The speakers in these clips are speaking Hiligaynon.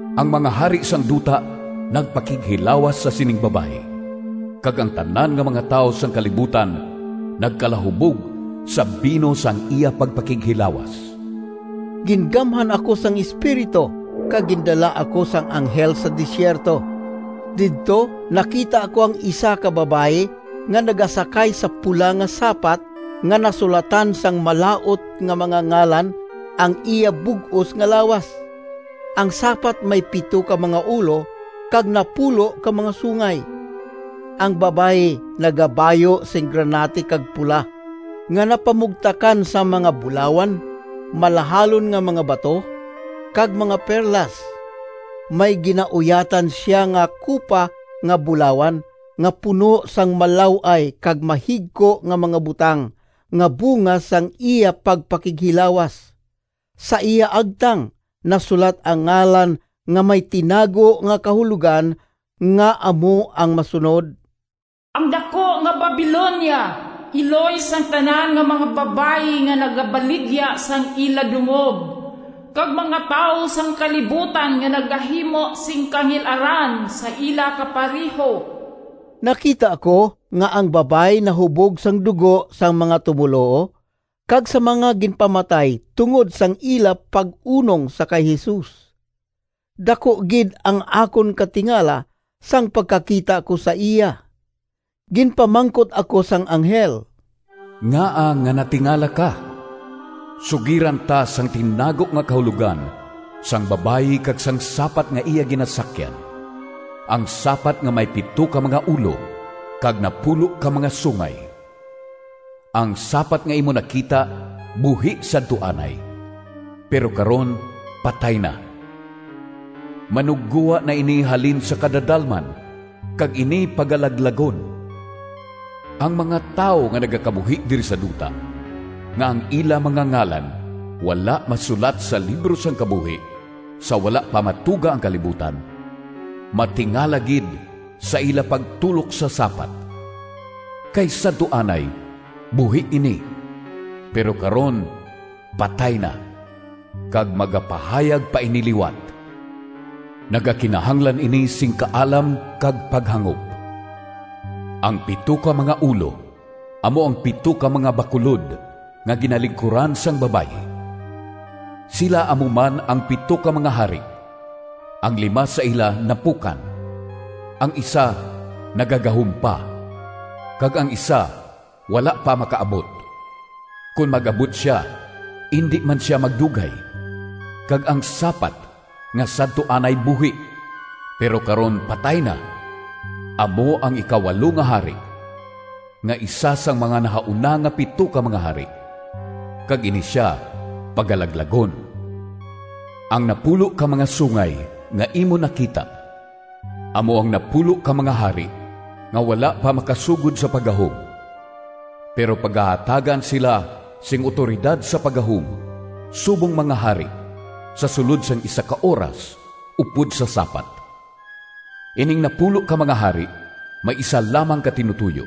Ang mga hari sang duta nagpakighilawas sa sining babayi, kag ang tanan nga mga tawo sang kalibutan nagkalahubog sa bino sang iya pagpakighilawas.” Gingamhan ako sang Espiritu, kag gindala ako sang anghel sa desierto. Didto nakita ko ang isa ka babayi nga nagasakay sa pula nga sapat nga nasulatan sang malaut nga mga ngalan ang iya bug-os nga lawas. Ang sapat may pito ka mga ulo kag napulo ka mga sungay. Ang babayi nagabayu sing granate kag pula, nga napamugtakan sang mga bulawan, malahalon nga mga bato, kag mga perlas. May ginauyatan sia nga kupa nga bulawan nga puno sang malaw-ay kag mahigko nga mga butang nga bunga sang iya pagpakighilawas. Sa iya agtang nasulat ang ngalan nga may tinago nga kahulogan nga amo ang masunod: “Ang daku nga Babilonia, iloy sang tanan nga mga babayi nga nagabaligya sang ila dungog, kag mga tawo sang kalibutan nga nagahimo sing kangil-aran sa ila kapareho.” Nakita ko nga ang babayi nahubog sang dugo sang mga tumoluo, kag sa mga ginpamatay tungod sang ila pag-unong sa kay Jesus. Daku gid ang akon katingala sang pagkakita ko sa iya. Ginpamangkot ako sang anghel, “Ngaa nga natingala ka? Sugiran ta sang tinago nga kahulogan sang babayi kag sang sapat nga iya ginasakyan, ang sapat nga may pito ka mga ulo kag napulo ka mga sungay. Ang sapat nga imo nakita buhi sadto anay, pero karon patay na. Manuggowa na ini halin sa kadadalman kag ini pagalaglagon. Ang mga tawo nga nagakabuhi diri sa duta, nga ang ila mga ngalan wala masulat sa libro sang kabuhi sa wala pa matuga ang kalibutan, matingala gid sa ila pagtulok sa sapat. Kay sadto anay buhi ini, pero karon patay na, kag magapahayag pa ini liwat. “Nagakinahanglan ini sing kaalam kag paghangop. Ang pito ka mga ulo amo ang pito ka mga bakulod nga ginalingkuran sang babayi. Sila amo man ang pito ka mga hari: ang lima sa ila napukan, ang isa nagagahom pa, kag ang isa wala pa makaabot. Kon mag-abot sia, indi man sia magdugay. Kag ang sapat nga sadto anay buhi, pero karon patay na, amo ang ikawalo nga hari nga isa sang mga nahauna nga pito ka mga hari, kag ini sia pagalaglagon. “Ang napulo ka mga sungay nga imo nakita amo ang napulo ka mga hari nga wala pa makasugod sa paggahom, pero pagahatagan sila sing awtoridad sa paggahom subong mga hari sa sulod sang isa ka oras upod sa sapat. Ining napulo ka mga hari may isa lamang ka tinutoyo,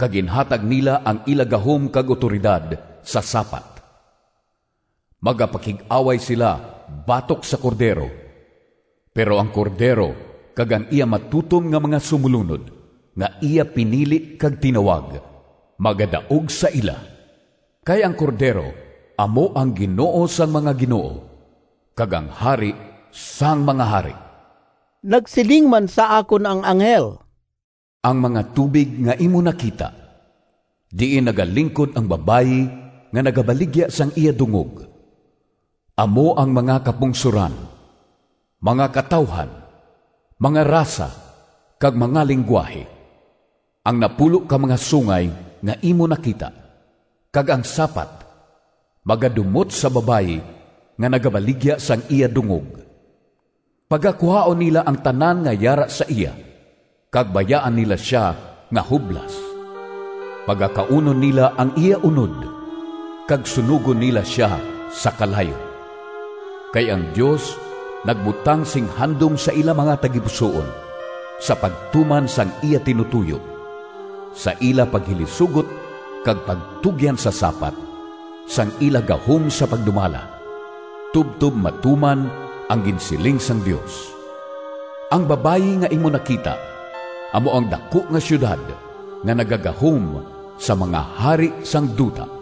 kag ginhatag nila ang ila gahom kag awtoridad sa sapat. Magapakig-away sila batok sa Cordero, pero ang Cordero kag ang iya matutom nga mga sumolunod nga iya pinili kag tinawag, magadaog sa ila. Kay ang Cordero amo ang Ginoo sang mga ginoo kag ang Hari sang mga hari.” Nagsiling man sa akon ang anghel: “Ang mga tubig nga imo nakita diin nagalingkod ang babayi nga nagabaligya sang iya dungog, amo ang mga kapungsoran, mga katawuhan, mga rasa, kag mga linggwahe. Ang napulo ka mga sungay nga imo nakita, kag ang sapat, magadumot sa babayi nga nagabaligya sang iya dungog. Pagakuhaon nila ang tanan nga yara sa iya kag bayaan nila sia nga hublas. Pagakaunon nila ang iya unod, kag sunogon nila sia sa kalayo. Kay ang Dios nagbutang sing handom sa ila mga tagipusoon sa pagtuman sang iya tinutoyo, sa ila paghilisugot kag pagtugyan sa sapat sang ila gahom sa pagdumala, tubtob matuman ang ginsiling sang Dios. “Ang babayi nga imo nakita amo ang daku nga siyudad nga nagagahom sa mga hari sang duta.”